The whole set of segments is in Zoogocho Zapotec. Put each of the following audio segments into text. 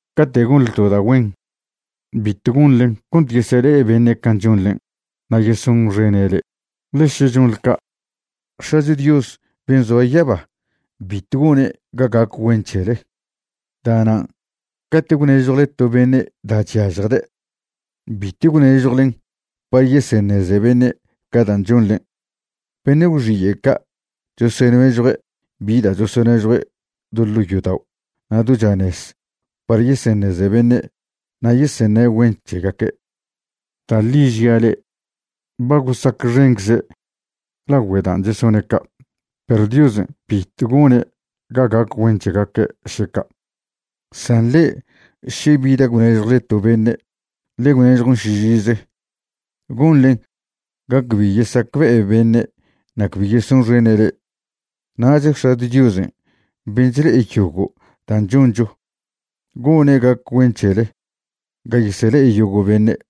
’Cate' gonḻe to da' güen, bitw gonḻen cont yesele'e beṉe' can' chonḻen' na' yesonxene' le'e, ḻe še chonḻe ca', X̱acho Dios ben' zoa yaba bitw gone' ga gac güen c̱hele. Da'nan' cate' gwnežjwle to beṉe' da' chyažjde', bitw gwnežjwlen par yeseṉeze beṉe' ca dan' chonḻen'. Beṉe' gwxiye' ca' chosonežjue' bi da' chosonežjue' do ḻo' yodao' na' do chanez par yeseṉeze beṉe' na' yeseṉe' güen c̱hegaque'. Da' ḻi žia' le'e, ba gosacxencze' lagüe da' chesone' ca', perw Diosen' bitw gone' ga gac güen c̱hegaque' še ca'. San le'e, še bi da' gwnežjwle to beṉe', ḻe gwnežjon šižize. Gonḻen ga cbi yesacbe'e beṉe' na' cbi yesonxene' le'e, nach X̱acho Diosen' ben' chle'ede' yogo' dan' choncho gone' ga gac güen c̱hele ga yesele'e yogo' beṉe'.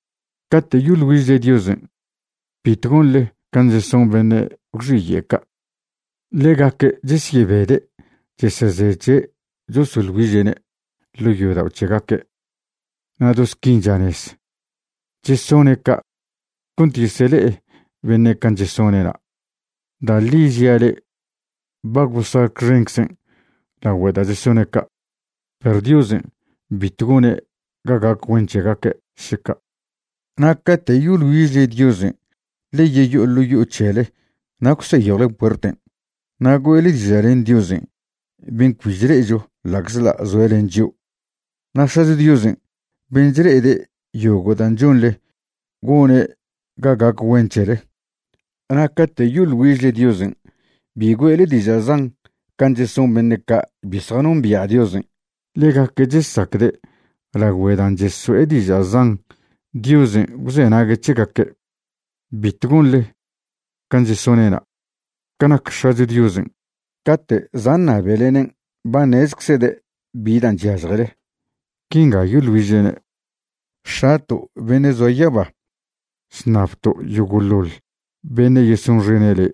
’Cate' yoḻ güižle Diosen', bitw gonḻe can' cheson beṉe' gwxiye' ca'. Ḻegaque' chesyebede' chesezeche' chosoḻ güiže'ne' ḻo' yodao' c̱hegaque', na' do squin chanez. Chesone' ca' cont yesele'e beṉe' can' chesone'na'. Da' ḻi žia' le'e, ba gosacxenczen' lagüe da' chesone' ca', perw Diosen' bitw gone' ga gac güen c̱hegaque' še ca'. Na' cate' yoḻ güižle Diosen', ḻe yeyo'o ḻo' yo'o c̱hele na' gwseyjwle puerten' na' güe'le diža' len Diosen' ben' cbi chle'echo ḻa'czḻa' zoe' len chio'. Na' X̱acho Diosen' ben' chle'ede' yogo' dan' chonḻe gone' ga gac güen c̱hele. ’Na' cate' yoḻ güižle Diosen' bi güe'le diža' zan can' cheson beṉe' ca' bi zjanombia' Diosen'. Ḻegaque' chesacde' lagüe' dan' cheso'e diža' zan Diosen' gwzenague' c̱hegaque'. Bitw gonḻe can' chesone'na'. Ca nac X̱acho Diosen', cate' za' ṉabelenen' ba ṉezczede' bi dan' chyažjele. Quinga yoḻ güižlene': X̱ato' beṉe' zoa yaba, chṉabto' yogo'ḻoḻ beṉe' yesonxene' le'.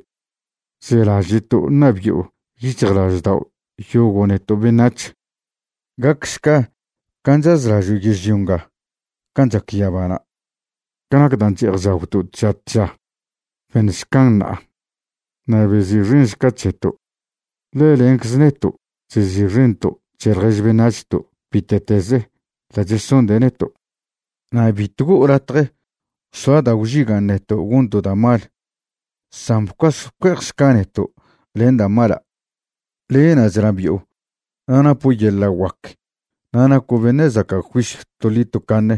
Zelaže'to' ṉabi'o yic̱hjlaždao' yogo' neto' beṉac̱h. Gacšca can' chazlažo' yežlio nga can' chac yabana'. Ca nac dan' che'ej chagwto' tža tža, beṉšcan ṉa'a. Na' bezi'xenšca c̱heto', ḻe lencze neto' chezi'xento' c̱he ḻjež beṉac̱hto' bite'teze da' chesonde' neto'. Na' bitw go'o latje soa da' gwžigan' neto' gonto' da' mal, san bcuas bcue'ejšca neto' len da' mala'. Le'na' chnabi'o na' napo' yeḻa' guac na' naco' beṉe' zaca' juisyw toḻi tocaṉe.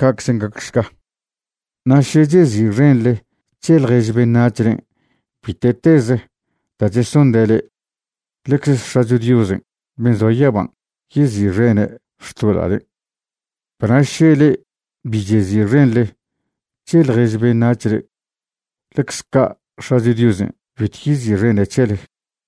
Ca'czen' gacšca. ’Na' še chezi'xenḻe c̱he ḻjež beṉac̱hlen' bite'teze da' chesonde' le'e, ḻecze X̱acho Diosen' ben' zoa yaban' yezi'xene' xtoḻa'len'. Perw na' še le'e bi chezi'xenḻe c̱he ḻjež beṉac̱hle, ḻecze ca' X̱acho Diosen' bitw yezi'xene' c̱helen'.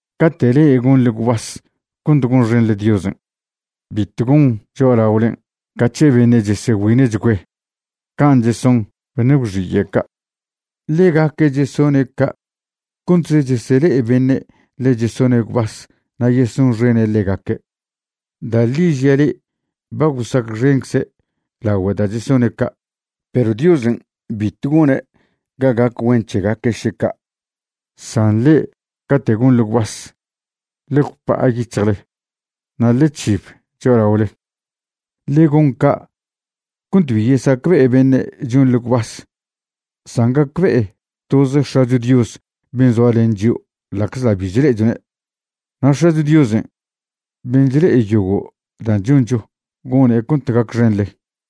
’Cate' le'e gonḻe gwbas cont gonxenḻe Diosen', bitw gon cho'alaolen' ca c̱he beṉe' chegüine'chgüe', can' cheson beṉe' gwxiye' ca'. Ḻegaque' chesone' ca' contze chesele'e beṉe' ḻe chesone' gwbas na' yesonxene' ḻegaque'. Da' ḻi žia' le'e, ba gosacxencze' lagüe da' chesone' ca', perw Diosen' bitw gone' ga gac güen c̱hegaque' še ca'. San le'e cate' gonḻe gwbas, ḻe gwpa'a yic̱hjle na' ḻe c̱hib cho'alaole. Ḻe gon ca' cont bi yesacbe'e beṉe' chonḻe gwbas, san gacbe'e toz X̱acho Dios ben' zoa len chio' ḻa'czḻa' bi chle'echone'. Na' X̱acho Diosen' ben' chle'e yogo' da' choncho gone' cont gacxenḻe.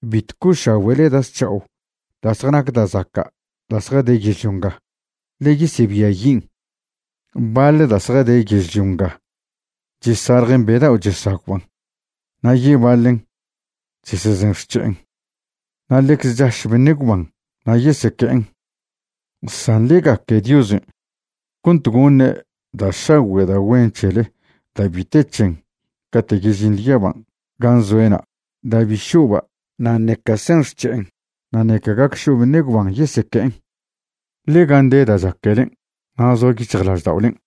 ’Bitw co'ošagüe'le da' zc̱ha'o da' zjanac da' zaca' da' zjade yežlio nga, ḻe yesebiayin'. Baḻ da' zjade yežlio nga chesaljen be dao' chesagwban', na' yebaḻen chesezen xc̱he'en, na' ḻecze chaš beṉe' gwban na' yeseque'en. San ḻe gaque Diosen' cont goṉe' da' šagüe' da' güen c̱hele da' bi te c̱hen cate' yežinḻe yaban' gan' zoe'na', da' bi šo'ba', na' ṉeca sen xc̱he'en, na' ṉeca gac šo' beṉe' gwban yeseque'en. Ḻe gan' de dan' chaquelen' na' zoa yic̱hjlažda'olen'.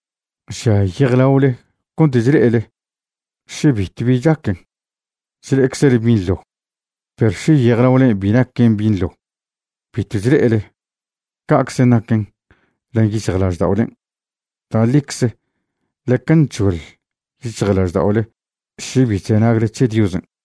’Žia yejlaole cont chle'ele. Še bitw bi chaquen, chle'eczele binḻo. Perw še yejlaolen' bi naquen binḻo, bitw chle'ele. Ca'czen' naquen len yic̱hjlažda'olen'. Da' ḻicze ḻeca nc̱hoḻ yic̱hjlažda'ole še bi chzenagle c̱he Diosen'.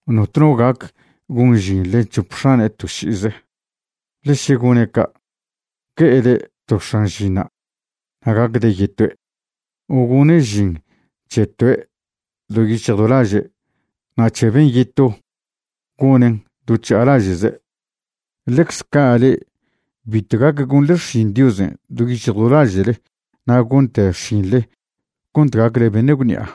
’Notno gac gon žin len c̱hope x̱ane' to ši'ize, ḻe še gone' ca', gue'ede' to x̱an žinṉa' na' gacde' yetoe'; o gone' žin c̱he toe' do yic̱hj do laže' na' c̱he ben' yeto gonen' to chža'alaže'ze. Ḻecze ca' le'e bitw gac gonḻe xšin Diosen' do yic̱hj do laže'le na' gonte xšinḻe cont gacle beṉe' gwṉi'a.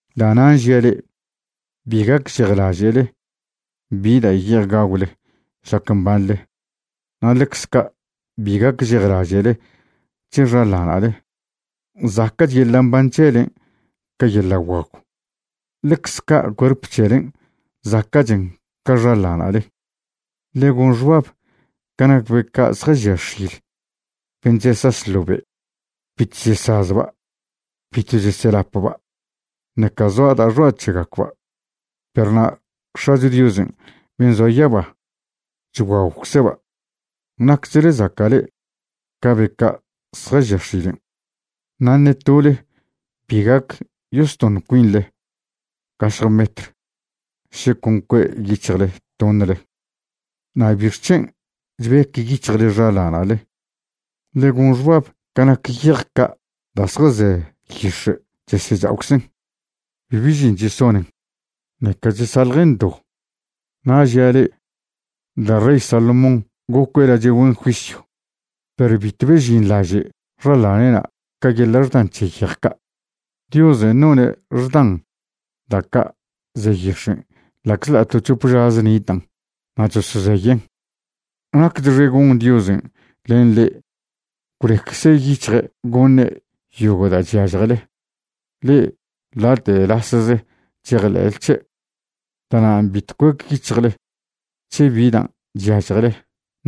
’Da'nan' žia' le'e, bi gacžejlaže'le bi da' ye'ej gagwle šlac mbanḻe, na' ḻecze ca' bi gacžejlaže'le c̱he xaḻana'le. Zaca'ch yeḻa' mban c̱helen' ca yeḻa' guagw. Ḻecze ca' cuerp c̱helen', zaca'chen ca xaḻana'le. Ḻe gon xbab ca nac be ca' zjažia x̱il ben' chesaš ḻo be', bitw chesazba', bitw cheselapba', ṉeca zoa da'a xoa' c̱hegacba', perw na' X̱acho Diosen' ben' zoa yaba chguagwcze'ba'. ¡Nacchle zaca' le'e ca be ca' zjažia x̱ilen'! Na' ṉe tole bi gac yostoṉ cuinḻe gašje metr še con cue' yic̱hjle toṉle. ’Na' ¿bixc̱hen' chbec yic̱hjle xaḻana'le? Ḻe gon xbab ca nac yej ca' da' zjaze yix̱e' chesecha'oczen'. Bibi žin chesonen, ṉeca chesaḻjen do. Na' žia' le'e, da' rey Salomón gocue' lache' güen juisyw, perw bitw bežinḻaže' xaḻane'na' ca yeḻa' xdan c̱he yej ca'. Diosen' none' xdan da' ca' ze yix̱en' ḻa'czḻa' to c̱hop žaze nitan' na' chosozeyen'. Nacchxe gon Diosen' len le'e gwleccze yic̱hje' goṉe' yogo' da' chyažjele, le'e late' lasze chejḻe'le c̱he'. Da'nan' bitw cuec yic̱hjle c̱he bi dan' chyažjele,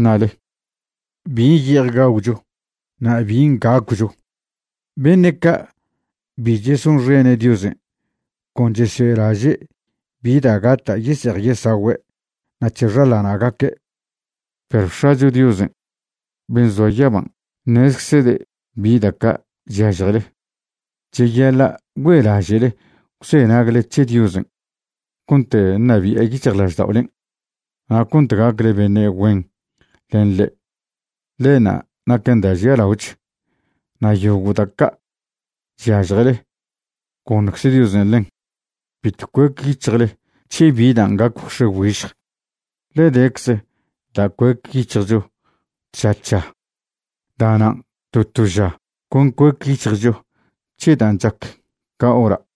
ṉale': “¿Bin' ye'ej gagwcho na' bin' gacwcho?” Beṉe' ca' bi chesonxene' Diosen' con chesoe'laže' bi da' gata' yese'ej yesagüe' na' c̱he xaḻana'gaque'. Perw X̱acho Diosen' ben' zoa yaban' ṉezczede' bi da' ca' chyažjele. Cheyaḻa' güe'laže'le gwzenagle c̱he Diosen' cont ṉabi'e yic̱hjlažda'olen' na' cont gacle beṉe' güen len ḻe', ḻenṉa' naquen da' žialaoch, na' yogo' da' ca' chyažjele, goṉcze Diosen' ḻen. Bitw cuec yic̱hjle c̱he bi dan' gac gwx̱e güižj, ḻe decze da' cuec yic̱hjcho tža tža. Da'nan' to to ža con cuec yic̱hjcho c̱he dan' chac ca hora'.